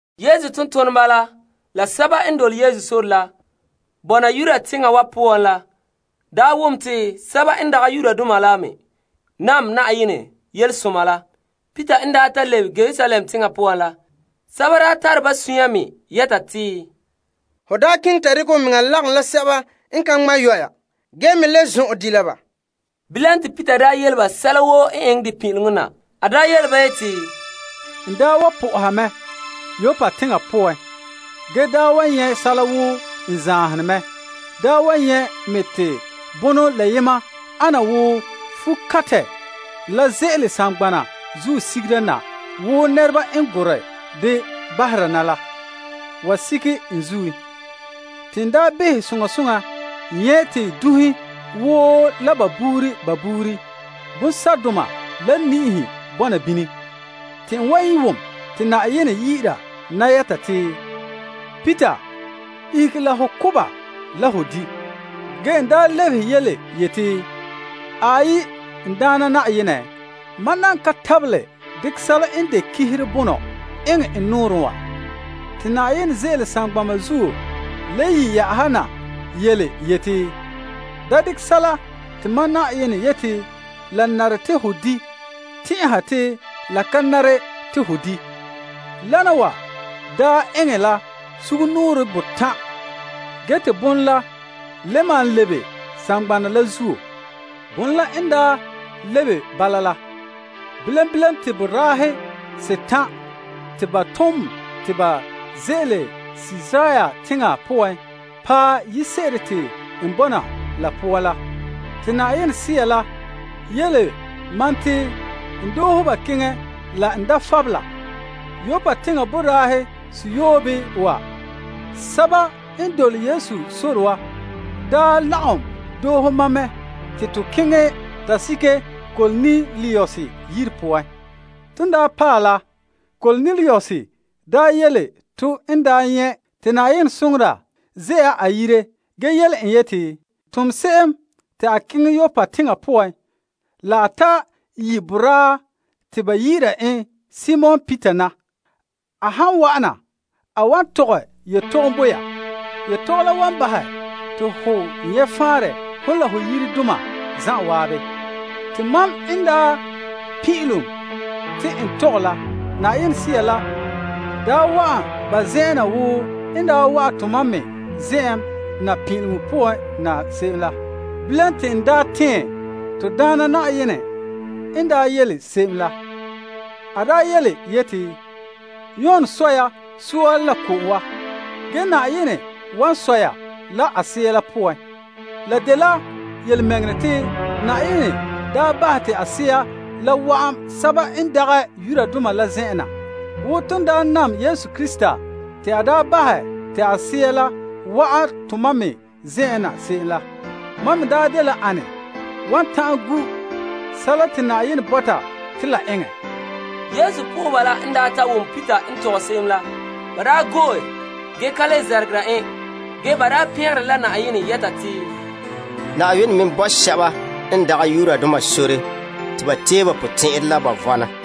Yesu tontoneba la sɛba n dole Yesu sore la bɔna Yudea teŋa wa poan la, daa wom te sɛba n dagɛ Yudoma la me nam Yenɛ yelehom la. Te Peter n ta lebe Yerusalem teŋa poan la, ba tare ba sunya mɛ yɛta te, Ho daa keŋɛ ta dekɛ ho mea lagom la sɛba n ka ŋma' yɔya ge me le zɔn'ɛn di' la ba. Ge Peter yele ba sɛla woo n eŋɛ de pin'ileŋɔ na yeti, N daa wa soha mɛ Yoppa teŋa poan ge daa wa nyɛ' liligere zahene te bon la yema ana wo fuo kantɛ la ze'ele saŋgbanɛ zuo sigera na wo nɛreba n gorɛ dɛ bahera na la wa sigɛ n zuin. Te n behɛ soŋa soŋa nyɛ' te dunhe woo la ba buuri ba buuri, bonsɛ'doma la niihe bɔna bini. Te n wa wom te Yenɛ yi'ire na yɛta te, Peter, ihege la ho ko' ba la ho di'. Ge n daa lebehe yeti, Aai, n Daana Na'ayenɛ, mam nan ka tabelɛ dekɛ sɛla n de ganleŋɔ bonɔ eŋɛ n nɔɔrɛn wa. Te Yenɛ ze'ele saŋgbana zuo le yi' na yeti, Da dekɛ sɛla te mam Yenɛ yete la nare te ho di' tɛn'ɛha te la ka nare te ho di'. Wana wa daa eŋɛ la sugumnɔɔren botan' ge te bonɔ la le malom lebe saŋgbanɛ la zuo. Bonɔ la n daa lebe bala la, bilam bilam te boraahe setan' te ba tom te ba ze'ele Kaesarea teŋa poan paɛ yire se'ere te n bɔna la poan na. Te Yenɛ Sea la yele ma te n doohe ba keŋɛ la n da fabela. Yoppa teŋa boraahe seyoobe wa, sɛba n dole Yesu sore wa, daa lagom doohe mam mɛ te to keŋɛ ta sige Kornelius yire poan. Ton daa paɛ la, Kornelius daa yele to n daa nyɛ' te Yenɛ soŋora ze'a a yire ge yele en yeti, Tom se'em te a keŋɛ Yoppa teŋa poan la ta yi' boraa te ba yi'ira en Simon Peter na. A han wa'ana, a wan tɔgɛ yetɔgom bo ya. Yetɔgom la wan bahɛ te ho nyɛ' faanrɛ hon la ho yiredoma zan'an. Te mam n daa pin'ilom te n tɔgɛ la, Yenɛ Sea la daa wa'an ba zen'an na wo n daa wa'an tomam me zen'an na pin'ileŋɔ poan na se'em la. Bilam te n daa tɛɛn to Daana Na'ayenɛ n daa yele se'em la. A daa yeti, Yon sɔ ya soa la ko'om wa, ge Yenɛ wan sɔ ya la a Sea poan. La dela yelemɛŋɛrɛ te Yenɛ daa bahɛ te a Sea la wa'an sɛba n dagɛ Yudoma la zen'an na wo ton daa nam to Na'ayenɛ Yesu Krista te a daa bahɛ te a Sea la wa'an tomam me zen'an na se'em la. Mam me daa dela ane wa ta'an gu' sɛla te Yenɛ bɔta te la a eŋɛ? Yesu po'oheba la n daa ta wom Peter n tɔgɛ se'em la, ba daa go'e ge ka le zɛrɛgerɛ en ge ba daa pɛngere la Yenɛ yɛta te, Yenɛ me bo sɛba n dagɛ Yudoma sore te ba tee ba potɛn'ɛra la ba vɔna.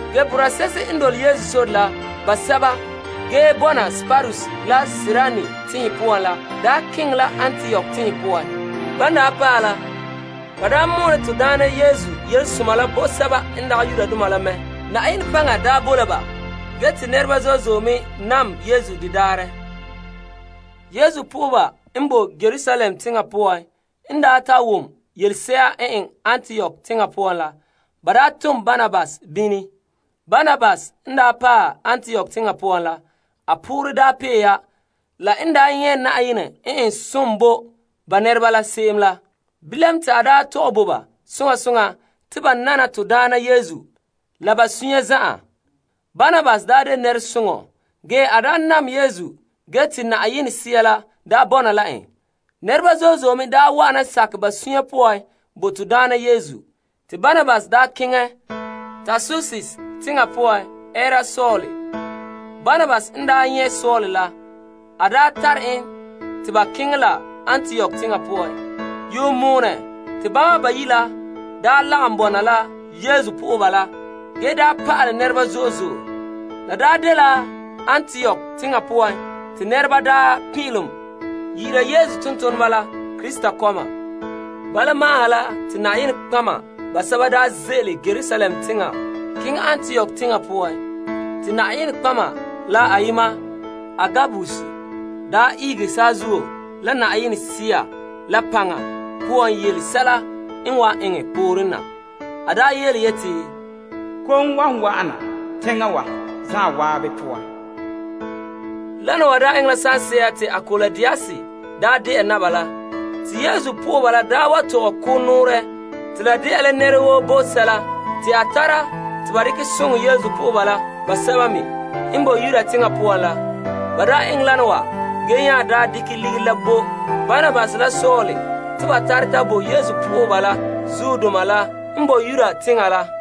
Ge boraa se'ehe n dole Yesu sore la basɛba ge bɔna Kiprus la Kirene teŋhe poan la daa keŋɛ la Antiok teŋa poan. Ban daa paɛ la, ba daa mɔɔlɛ to Daana Yesu Yelesoma la bo sɛba n dagɛ Yudoma la mɛ. Na'ayenɛ paŋa daa boe la ba ge te nɛreba zo'e zo'e daa me nam Yesu de daarɛ. Yesu lagaŋɔ la n boe Yerusalem teŋa la poan n daa ta wom yelese'a n eŋɛ Antiok teŋa poan la, ba daa tom la Barnabas bini. Barnabas n paɛ Antiok teŋa poan la, a poorɛ pee ya la n nyɛ' Yenɛ n eŋɛ som bo ba nɛreba la se'em la. Bilam te a tɔgɛ bo ba soŋa soŋa te ba nana to Daana Yesu bala la ba sunya zan'an. Barnabas dela nɛresoŋɔ, ge a nam Yesu ge te Yenɛ Sea la bɔna la en. Nɛreba zo'e zo'e me wa'ana sakɛ ba sunya poan bo to Daana Yesu. Te Barnabas keŋɛ Tarsus teŋa poan ɛɛra Saul. En nyɛ' Saul la, a daa tare en te ba keŋɛ la Antiok teŋa poan. Yuun moone te bama bayi' la lagom bɔna la Yesu lagaŋɔ la ge pa'alɛ nɛreba zo'e zo'e. La dela Antiok teŋa poan te nɛreba daa pin'ilom yi'ira Yesu tontoneba la te Krista nɛreba. Bala ma'an ha la te nɔtɔgɔheba basɛba ze'ele Yerusalem teŋa keŋɛ Antiok teŋa poan. Te nɔtɔgɔheba la ayema Agabus ihege saazuo la Yenɛ Sea la paŋa poan yele sɛla n wan wa'an pooren na. A yeti, Kom wan wa'ana teŋa wa zan'an poan. Wana wa daa eŋɛ la saŋse'a te Klaudius daa de'a Naba la. Te Yesu dɔlɔba la tɔgɛ ko' nɔɔrɛ te la de'a la nɛra woo bo sɛla te a tara te ba dekɛ soŋɛ Yesu po'oheba basɛba me n boe Yudea teŋa poan la. Ba eŋɛ wana wa ge nya dekɛ ligiri la bo Barnabas la Saul te ba tare ta bo Yesu lagaŋɔ zuodoma la n boe Yuda teŋa la.